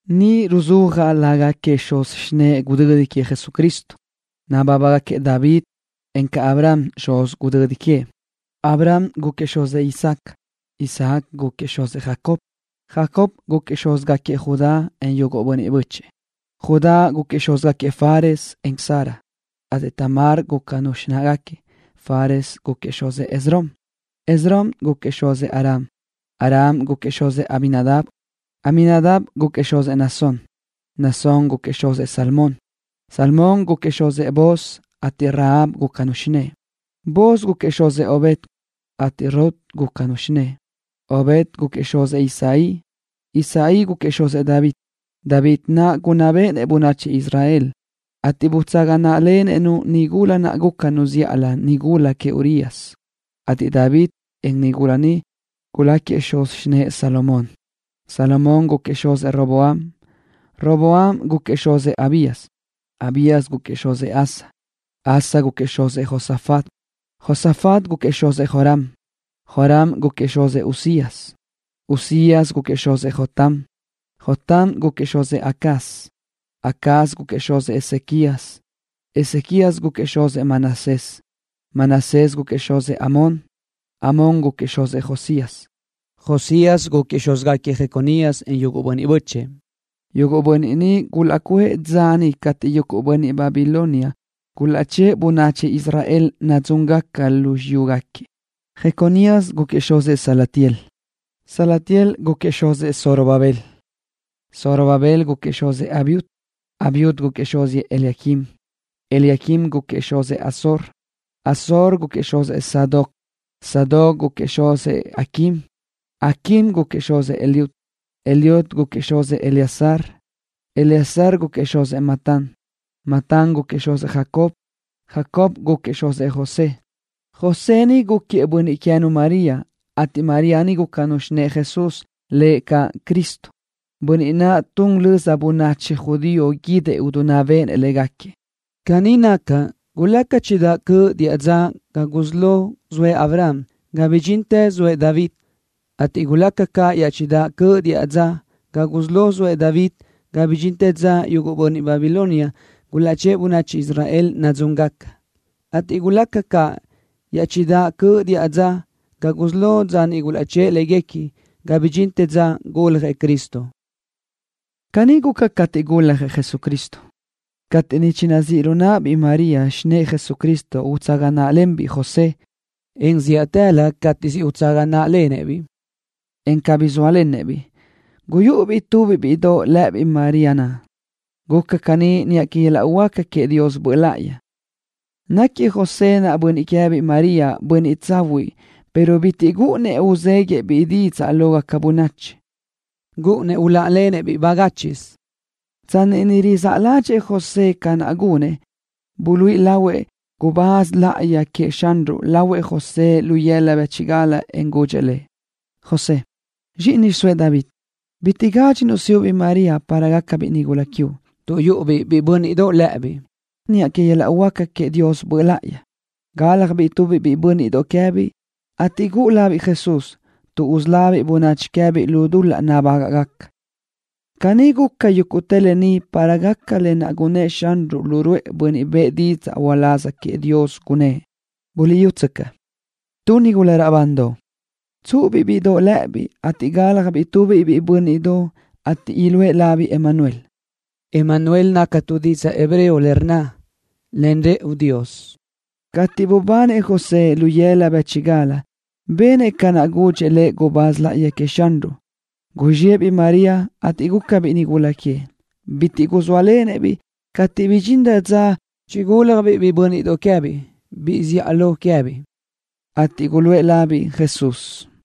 Ni ruzúajaʼ lágaquiëʼ xuz xinëʼe gudödi queëʼ Jesucristo. Nabábagaquiëʼ David, encaʼ Abraham xuz gudödi queëʼ. Abraham gúquiëʼ xuzëʼ Isaac. Isaac gúquiëʼ xuzëʼ Jacob. Jacob gúquiëʼ xúzgaquiëʼ Judá, en yuguʼ bönniʼ bö́chëʼë. Judá gúquiëʼ xúzgaquiëʼ Fares, en Zara, ateʼ Tamar gúcanu xináʼagaquiëʼ. Fares gúquiëʼ xuzëʼ Esrom. Esrom gúquiëʼ xuzëʼ Aram. Aram gúquiëʼ xuzëʼ Aminadab. Aminadab gúquiëʼ xuzëʼ Naasón. Naasón gúquiëʼ xuzëʼ Salmón. Salmón gúquiëʼ xuzëʼ Booz, ateʼ Rahab gúcanu xinë́ʼë. Booz gúquiëʼ xuzëʼ Obed, ateʼ Rut gúcanu xinë́ʼë. Obed gúquiëʼ xuzëʼ Isaí. Isaí gúquiëʼ xuzëʼ David. David naʼ gunná béʼenëʼ bönachi Israel, ateʼ butsaga náʼalenëʼ-nu nigula naʼ gúcanu zíʼalö nigula queëʼ Urías, ateʼ David, en nigula ni guláquiëʼ xuz xinë́ʼë Salomón. Salomón gúquiëʼ xuzëʼ Roboam. Roboam gúquiëʼ xuzëʼ Abías. Abías gúquiëʼ xuzëʼ Asa. Asa gúquiëʼ xuzëʼ Josafat. Josafat gúquiëʼ xuzëʼ Joram. Joram gúquiëʼ xuzëʼ Uzías. Uzías gúquiëʼ xuzëʼ Jotam. Jotam gúquiëʼ xuzëʼ Acaz. Acaz gúquiëʼ xuzëʼ Ezequías. Ezequías gúquiëʼ xuzëʼ Manasés. Manasés gúquiëʼ xuzëʼ Amón. Amón gúquiëʼ xuzëʼ Josías. Josías gúquiëʼ xúzgaquiëʼ Jeconías, en yuguʼ bönniʼ bö́chëʼë. Yuguʼ bönniʼ ni gulaʼcuʼë dza niʼ cateʼ yuguʼ bönniʼ Babilonia gulaʼchë́ʼë bönachi Israel nadzúngaca lu xiyúgaquiëʼ. Jeconías gúquiëʼ xuzëʼ Salatiel. Salatiel gúquiëʼ xuzëʼ Zorobabel. Zorobabel gúquiëʼ xuzëʼ Abiud. Abiud gúquiëʼ xuzëʼ Eliaquim. Eliaquim gúquiëʼ xuzëʼ Azor. Azor gúquiëʼ xuzëʼ Sadoc. Sadoc gúquiëʼ xuzëʼ Aquim. Aquim gúquiëʼ xuzëʼ Eliud. Eliud gúquiëʼ xuzëʼ Eleazar. Eleazar gúquiëʼ xuzëʼ Matán. Matán gúquiëʼ xuzëʼ Jacob. Jacob gúquiëʼ xuzëʼ José. José ni gúquiëʼ bönniʼ queë́nu María, ateʼ María ni gúcanu xinë́ʼë Jesús, lëʼ caʼ Cristo, Bönniʼ naʼ tun löza bönachi judío guídëʼ idinná béʼenëʼ légaquiëʼ. Caní naca, gulaca chidáʼ cöʼ diʼa dza ga gusí lo zoëʼ Abraham ga bidxintë zoëʼ David, ateʼ gulaca caʼ iaʼchidáʼ cöʼ diʼa dza ga gusí lo zoëʼ David ga bidxintë dza yuguʼ bönniʼ Babilonia gulaʼchë́ʼë bönachi Israel nadzúngaca, ateʼ gulaca caʼ iaʼchidáʼ cöʼ diʼa dza ga gusí lo dza niʼ gulaʼchë́ʼë léguequi ga bidxintë dza guljëʼ Cristo. Caní guca cateʼ guljëʼ Jesucristo. Cateʼ niʼ chinazíʼ lu náʼabiʼ María, xinë́ʼë Jesucristo utsaga náʼalenbiʼ José, en zíʼatëlö cateʼ siʼ utsaga náʼalenëʼ-biʼ, en cabí ne sóalenëʼ-biʼ, guyúʼubiʼ tubiʼ bíʼidoʼ lë́ʼëbiʼ María naʼ. Guca caní niʼa que yöl-laʼ huáca queëʼ Dios Böʼ Láʼayi. Náquiëʼ José naʼ, bönniʼ queë́biʼ María, bönniʼ tsahuiʼ, pero bitiʼ gúʼunnëʼ uzéguiëʼ-biʼ didzaʼ lógaca bönachi. Gúʼunnëʼ uláʼalenëʼ-biʼ bagáchiʼsö. Tsanni niʼ rizáʼ ládxëʼë José ca naʼ gunëʼ, buluíʼi lahuëʼ gubáz láʼayi queëʼ Xanruʼ lahuëʼ José lu yëla bë́chigal, en gudxëʼ lëʼ: —José, zxíʼini zxiʼsóëʼ David. Bitiʼ gádxinuʼ siʼu-biʼ María, para gácabiʼ nigula quiuʼ, tuʼ yúʼubiʼ biʼi bö́nniʼdoʼ lë́ʼëbiʼ niʼa que yöl-laʼ huáca queëʼ Dios Böʼ Láʼayi. Gáljabiʼ tubiʼ biʼi bö́nniʼdoʼ queë́biʼ, ateʼ guʼu labiʼ Jesús, tuʼ usölábiʼ bönachi queë́biʼ lu dul-laʼ nabágaʼgaca. Caní guca yúguʼtë lë ni para gaca lë naʼ gunnë́ʼ Xanruʼ lu ruʼë bönniʼ bëʼë didzaʼ uláz queëʼ Dios, gunnë́ʼ: Buliʼyútsöcaʼ, tu nigula raʼbandoʼ, tsúʼubiʼ bíʼidoʼ lë́ʼëbiʼ, ateʼ gáljabiʼ tubiʼ biʼi bö́nniʼdoʼ, ateʼ iluʼë labiʼ Emanuel. Emanuel naca tu didzaʼ hebreo le rnna: Len rëʼu Dios. Cateʼ bubanëʼ José lu yëla bë́chigal, benëʼ ca naʼ gudxëʼ gubáz láʼayi queëʼ Xanruʼ lëʼ, ateʼ guzxiʼë-biʼ María, ateʼ gúcabiʼ nigula queëʼ. Bitiʼ guzóalenëʼ-biʼ cateʼ bidxinrö dza chigúlajbiʼ biʼi bö́nniʼdoʼ queë́biʼ, biʼi zíʼalö queë́biʼ, ateʼ guluʼë labiʼ Jesús.